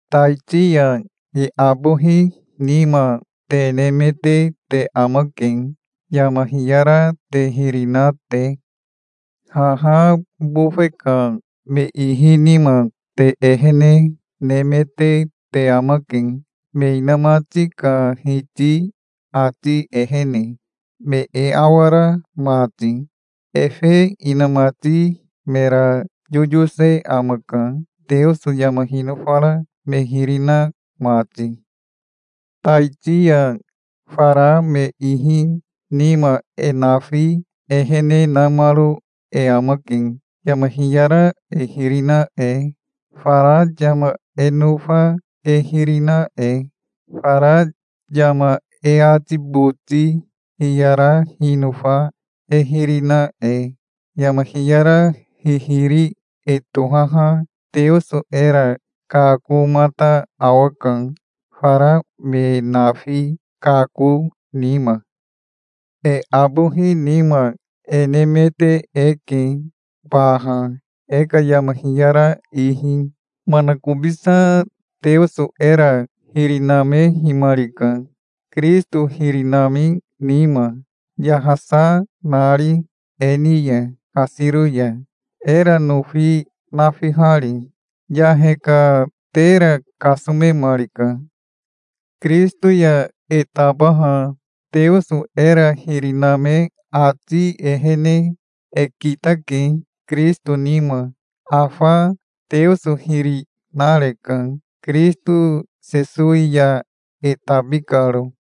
Taiti ya e abohi nima te nemete te amake, yama hiyara te hiri na te. Haha bofe ka me ihi nima te ehene nemete te amake, me inamati ka hiti ati ehene, me e awara mati. Efe inamati mera yoyose amaka, Teoso yama hinofara me hiri na mati. Taiti ya fara me ihi nima e nafi ehene namaro e amake, yama hiyara e hiri na e, fara yama e nofa e hiri na e, fara yama e ati boti hiyara hinofa e hiri na e. Yama hiyara hihiri e tohaha Teoso era kakomata awaka, fara me nafi kako nima. E abohi nima e nemete eke baha, e ka yama hiyara ihi. Manakobisa Teoso era hiri namehimarika, Kirisito hiri nami nima, yahasa nari e ni ya kasiro ya, era nofi nafihari. Yahe ka tera kasomemarika. Kirisito ya e tabaha Teoso era hiri name ati ehene e kitake Kirisito nima. Afa Teoso hiri nareka, Kirisito Sesowi ya e tabi karo.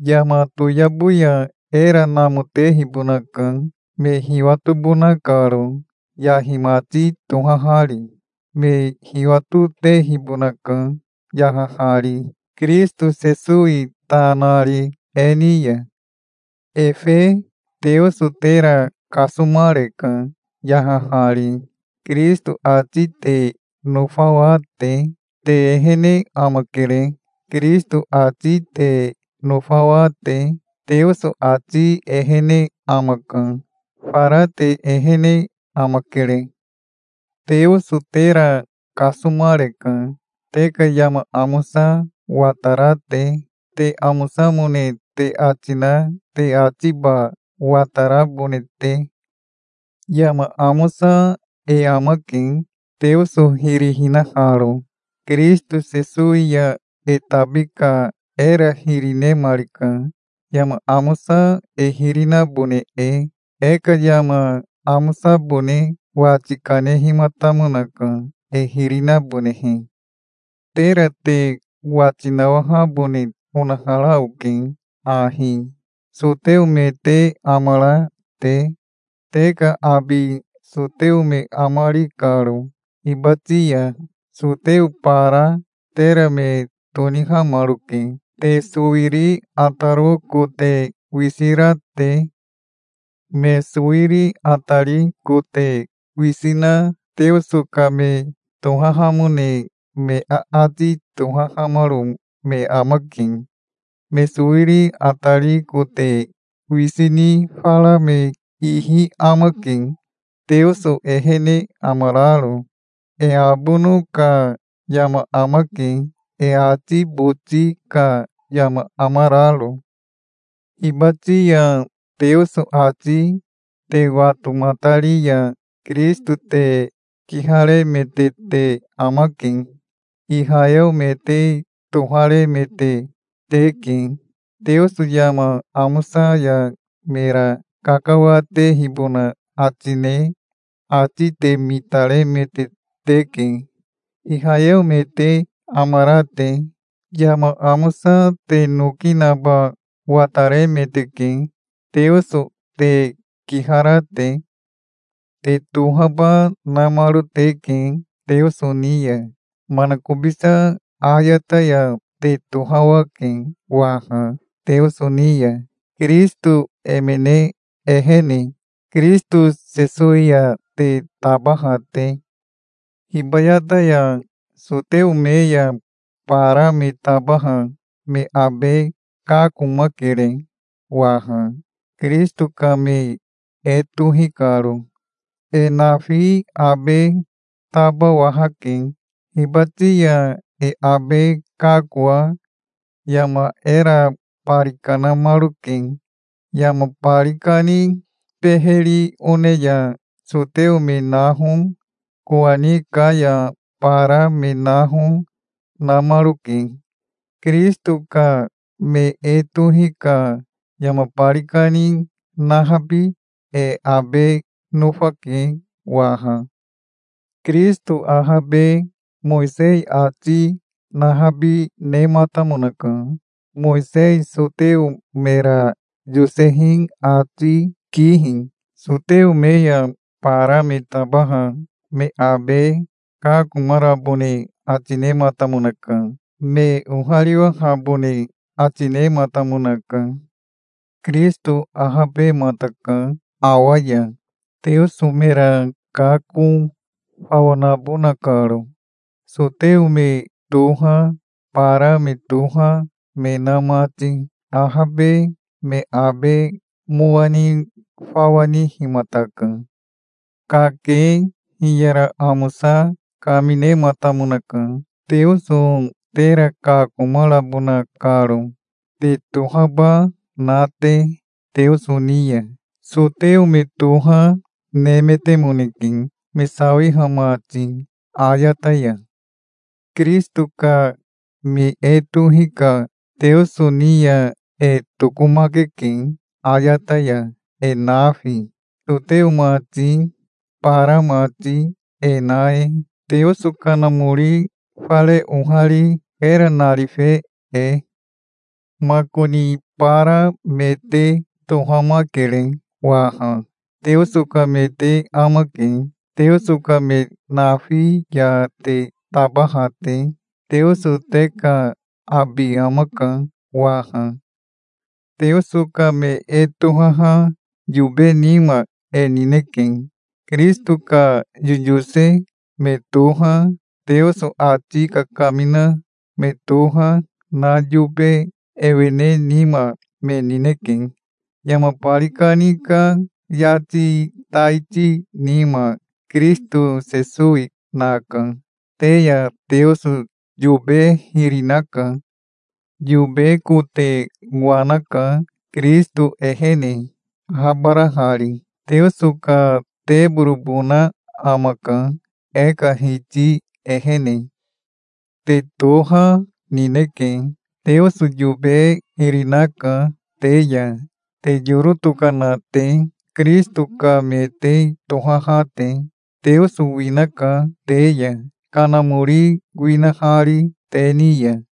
Yama toyabo ya era namotehibonaka, me hiwatobona karo, yahi mati tohahari. Me hiwatotehibonaka, yahahari, Kirisito Sesowi ta nari e ni ya. Efe Teoso tera kasomareka, yahahari, Kirisito ati te nofawa te. Te ehene amakere, Kirisito ati te nofawa te. Teoso ati ehene amaka. Fara te ehene amakere. Teoso tera kasomareka, te ka yama amosa watara te, te amosamone te ati na te atiba watarabone te. Yama amosa e amake, Teoso hiri hinaharo. Kirisito Sesowi ya e tabi ka era hiri nemarika, yama amosa e hiri nabone e. E ka yama amosabone wati kanehimatamonaka, e hiri nabonehe. Tera te wati nawahabone onahara oke ahi, soteo me te amara te, te ka abi soteo me amari karo. Hibati ya soteo bara tera me tonihamaroke, te sowiri ataro kote wisi ra te. Me sowiri atari kote wisi na Teoso ka me tohahamone me aati tohahamaro me amake. Me sowiri atari kote wisi ni fara me ihi amake, Teoso ehene amararo. E abono ka yama amake, e ati boti ka yama amararo. Hibati ya Teoso ati te watomatari ya Kirisito te kiharemete te amake. Ihayeo me te toharemete teke. Teoso yama amosa ya mera kakawatehibona ati ne ati te mitaremete teke, Ihayeo me te amara te. Yama amosa te noki naba wataremeteke, Teoso te kihara te. Te tohaba namaro teke Teoso ni ya. Manakobisa ayata ya te tohawake waha Teoso ni ya, Kirisito emene ehene, Kirisito Sesowi ya te tabaha te. Hibayata ya soteo me ya bara me tabaha me abe kakomakere waha, Kirisito ka me e tohi karo. E nafi abe tabawahake. Hibati ya e abe kakoa yama era bari kanamaroke. Yama bari kani beheri one ya soteo me naho, kowani ka ya bara me naho, namaroke. Kirisito ka me e tohi ka yama bari kani nahabi e abe nofake waha. Kirisito ahabe Mowisei ati nahabi nematamonaka, Mowisei soteo mera yosehi ati kihi. Soteo me ya bara me tabaha me abe kakomarabone ati nematamonaka. Me ohariwahabone ati nematamonaka. Kirisito ahabemataka awa ya, Teoso mera kako fawa nabona karo, soteo me toha, bara me toha, me na mati. Ahabe me abe mowa ni fawa nihimataka. Kake hiyara amosa kaminematamonaka, Teoso tera kakomarabona karo, te tohaba na te Teoso ni ya. Soteo me toha, nemetemoneke, me sawiha mati ayata ya. Kirisito ka me e tohi ka Teoso ni ya e tokomakeke ayata ya, e nafi, soteo mati, bara mati e na e, Teoso Kanamori fare ohari era narife e. Makoni bara me te tohamakere waha. Teoso ka me te amake, Teoso ka me nafi ya te tabaha te. Teoso te ka abi amaka waha. Teoso ka me e tohaha yobe nima e nineke. Kirisito ka yoyose me toha, Teoso ati kakamina me toha na yobe ewene nima me nineke. Yama bari kani ka yati taiti nima Kirisito Sesowi naka. Te ya Teoso yobe hiri naka. Yobe kote wanaka Kirisito ehene, ahabarahari. Teoso ka teborobona amaka, e ka Hiti ehene. Te toha nineke. Teoso yobe hiri naka te ya, te yoro tokana te, Kirisito ka me te tohaha te. Teoso winaka te ya, Kanamori winahari te ni ya.